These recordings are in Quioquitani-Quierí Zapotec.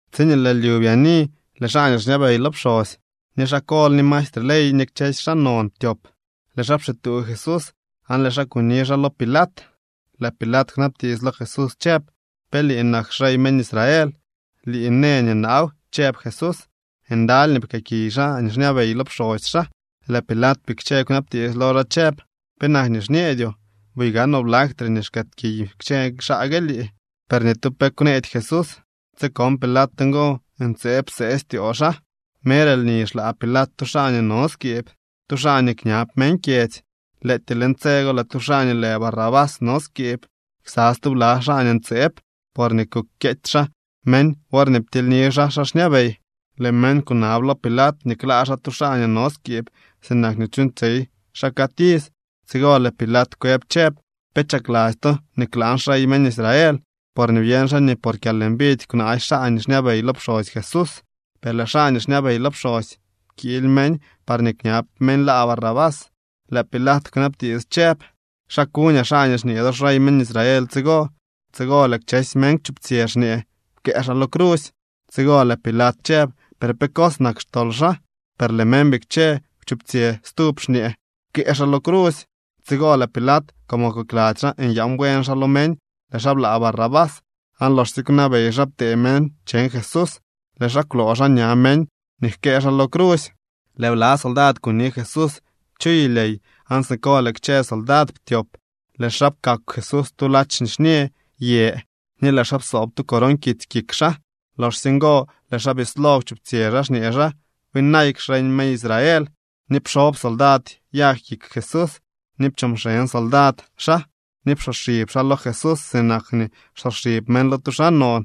Tsiñee lëë lyu byaani lëë xaa nii xñabey lo pxosy, ni xaa kol, ni maestre ley ni kchësy xaa non ptyop. Lëë xaa pxituu Jesús aan lëë xaa kuni xaa lo Pilat. Lëë Pilat kwnabtiits lo Jesús chëb: —¿Pe lii nak xrey meñ Israel? —Lii në nii naaw —chëb Jesús. Ndaly nii pkëëkiy xaa nii xñabey lo pxosy xaa. Lëë Pilat bikche kwnabtiits lo xaa chëb: —¿Penak nii xñeedyoo? Buy gaanoo blaktre nii xkëëkiy kchë xaa gue lii. Per ni tu pe kwneedy Jesús. Tsi kon Pilat ngo, ntseeb psee styoo xaa. Mer lni xlaa Pilat tu xaa nii no skiib, tu xaa nii kñab meñ kyedzy. Lëëtyee leñ tse go lëë tu xaa nii lë Barrabás no skiib ksa stubla xaa ntseeb porñee kukyeety xaa meñ worñee ptilyni xaa xaa xñabey. Lëë meñ kunab lo Pilat nii klaa xaa tu xaa nii no skiib sinak nii chuuñtsyey xaa cad iz. Tsigo lëë Pilat kwëb chëb: —¿Pe chakladzy to nii klaan xrey meñ Israel? Porñee byeñ xaa nii por kyalmbidy kwnaasy xaa nii xñabey lo pxosy Jesús. Per lëë xaa nii xñabey lo pxosy pkiily meñ parñee kñab meñ laa Barrabás. Lëë Pilat kwnabtiits chëb: —¿Xa kuñaa xaa nii xñee do xrey meñ Israel tsigo? Tsigo kchësy meñ kwchuptsyë xñee: —¡Pkëë xaa lo crusy! Tsigo lëë Pilat chëb: —¿Per pe cos nak xtol xaa? Per lëë meñ bikche kwchuptsyë stub xñee: —¡Pkëë xaa lo crusy! Tsigo lëë Pilat, como kokladzy xaa nyaan buen xaa lo meñ, lëë xaa blaa Barrabás. Aan loxsye kwnabey xaa ptee meñ cheñ Jesús, lëë xaa kwloo xaa ña meñ nii jkëë xaa lo crusy. Lëë bla soldad kuni Jesús chu yulyey aan siko lëë kchë soldad ptyop. Lëë xaa pkakw Jesús tu ladx nixñë yë ni lëë xaa psoob tu coron kitsy kik xaa. Loxsye ngo lëë xaa bislo kwchuptsyë xaa xñee xaa: —¡Byinayk xrey meñ Israel! Ni pxob soldad yag kik Jesús, ni pchoo mxeñ soldad xaa, ni psoxib xaa lo Jesús sinak nii xsoxib meñ lo tu xaa non.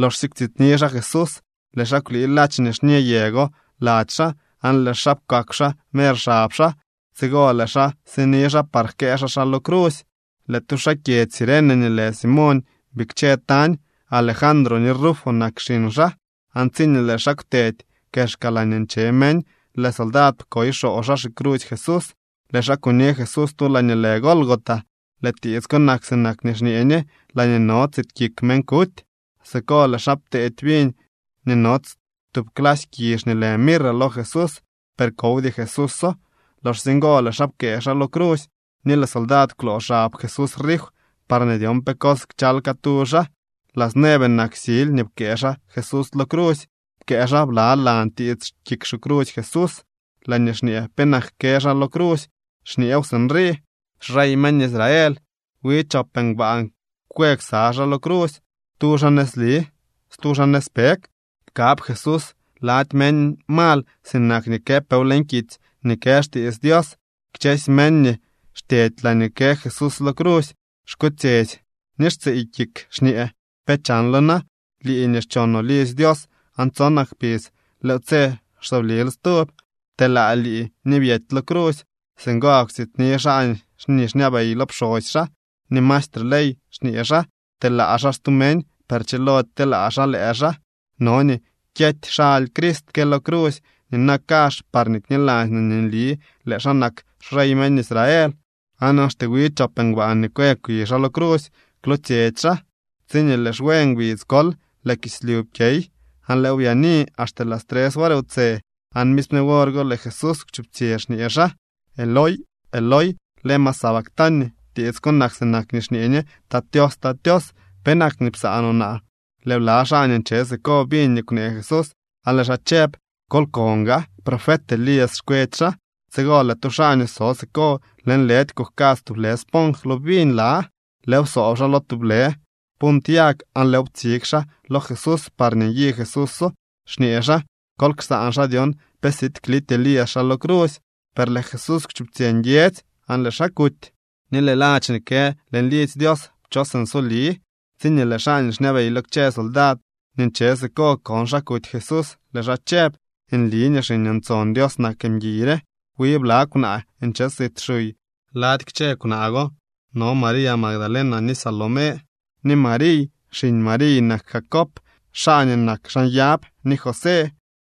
Loxsye kwtsityni xaa Jesús, lëë xaa kwlii ladx nixñë yë go lady xaa aan lëë xaa pkakw xaa mer xab xaa. Tsigo lëë xaa sini xaa par jkëë xaa xaa lo crusy. Lëë tu xaa kyedzy Cirene nii lë Simoñ bikche tañ. Alejandro ni Rufo nak xiñ xaa. Aan tsiñee lëë xaa kwtedy kexka laañee nche meñ, lëë soldad pkoy xoo xaa xicrusy Jesús. Lëë xaa kuni Jesús tu laañee lë Gólgota. (Lëë tiits ko nak sinak nii xñee ñe: Laañee no tsit kik meñ kuty.) Siko lëë xaa pteedy viñ nii nots tub clasy kizh nii lë mirra lo Jesús, per kowdy Jesúso. Loxsye ngo lëë xaa pkëë xaa lo crusy. Ni lëë soldad kwloo xab Jesús rif parñee dyon pe cos kchal catu xaa. Las nueve nak sily nii pkëë xaa Jesús lo crusy. Pkëë xaa blalan tiits kik xicrusy Jesús laañee xñee penak kë xaa lo crusy, xñeew sinrii: “Xrey meñ Israel.” Wi chop ngbaan kwë ksa xaa lo crusy, tu xaa nëzli, stu xaa nëzpeg. Pkab Jesús lady meñ mal sinak nii këpeew leñ kitsy nii kë xtiits Dios. Kchësy meñ nii xtyedy laañee kë Jesús lo crusy xkotsyetsy ni xtsiiy kik xñee: —¿Pe chanlo na?, lii nii xchonoo lidzy Dios aan tsonak kpidz lëëw tse xsoblil stub. Pteelaa lii ni byety lo crusy. Singo gak kwtsityni xaa nii xñabey lo pxosy xaa ni maestre ley xñee xaa: —Pteelaa xaa stu meñ, per chilody kteelaa xaa lëë xaa. No nii kyety xaly Crist ke lo crusy nina kazh parñee kniladzy no nii nli lëë xaa nak xrey meñ Israel. Aan axte wi chop ngbaan nii kwë kwi xaa lo crusy kwlootsyetsy xaa. Tsiñee lëë xwe ngbidz kol lëë kislyu pkyey aan lëëw byaani axte las tres wor wtse. Aan misme wor go lëë Jesús kwchuptsyë xñee xaa: —Eloi, Eloi, ¿lema sabactani? (Tiits ko nak sinak nii xñee ñe: Tat Tios, Tat Tios, ¿penak nii psaanoo naa?) Lëë bla xaa nii nche siko biñ nii kwnee Jesús aan lëë xaa chëb: —Kol kon gaa, profet Elías xkwetsy xaa. Tsigo lëë tu xaa nii so siko lëënlëdy kujkadz tublë sponj lo viñ la. Lëëw psoob xaa lo tublë punt yag aan lëëw ptsig xaa lo Jesús parñee nyi Jesúso, xñee xaa: —Kol ksaan xaa dyon pe siid klity Elías xaa lo crusy. Per lëë Jesús kwchuptsyë nguiedzy aan lëë xaa kuty. Ni lëë ladx nii kë leñ lidzy Dios pchos nsoli. Tsiñee lëë xaa nii xñabey lo kchë soldad nii nche siko kon xa kuty Jesús, lëë xaa chëb: —Nli nii Xiñ Dios nak mguiy re. Wi bla kwnaa nche sit xuy. Lady kchë kwnaa go no María Magdalena, ni Salomé, ni Mariy. Xiñ Mariy nak Jacob xaa nii nak xaa nyab ni José.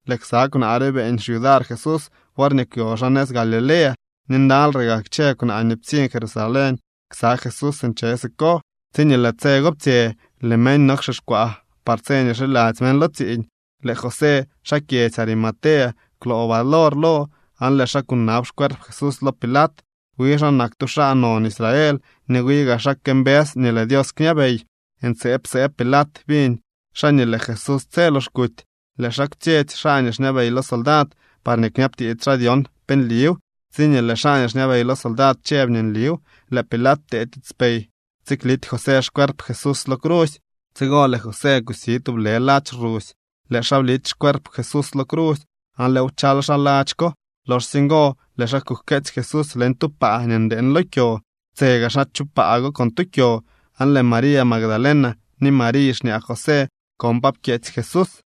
Lëë ksa kwnaa re beeñ xyudar Jesús worñee kwyo xaa nëz Galilea. Ni ndaly re kchë kwnaa nii ptsiñ Jerusalén ksa Jesús nche siko. Tsiñee lëë tse go ptsye lëë meñ no wxixkwaa par tse nii xiladzy meñ lo tsiiñ. Lëë José xaa kyedzy Arimatea kwloo valor lo aan lëë xaa kunab xcuerp Jesús lo Pilat. Wi xaa nak tu xaa non Israel, ni wi gaa xaa këmbës nii lëë Dios kñabey. Ntseeb psee Pilat biñ xaa nii lëë Jesús tse lox kuty. Lëë xaa kwtsyetsy xaa nii xñabey lo soldad parñee kñabtiits xaa dyon pe nliw. Tsiñee lëë xaa nii xñabey lo soldad chëb nii nliw, lëë Pilat ptee tiitspey tsiklity José xcuerp Jesús lo crusy. Tsigo lëë José kusi tublë ladx rusy, lëë xaa blity xcuerp Jesús lo crusy aan lëëw pchal xaa ladx ko. Loxsye ngo lëë xaa kujkeetsy Jesús leñ tu paa nii ndeeñ lo kyo. Ptse gaa xaa chu paa con tu kyo. Aan lëë María Magdalena ni Mariy xñaa José kon pa pkyeetsy Jesús.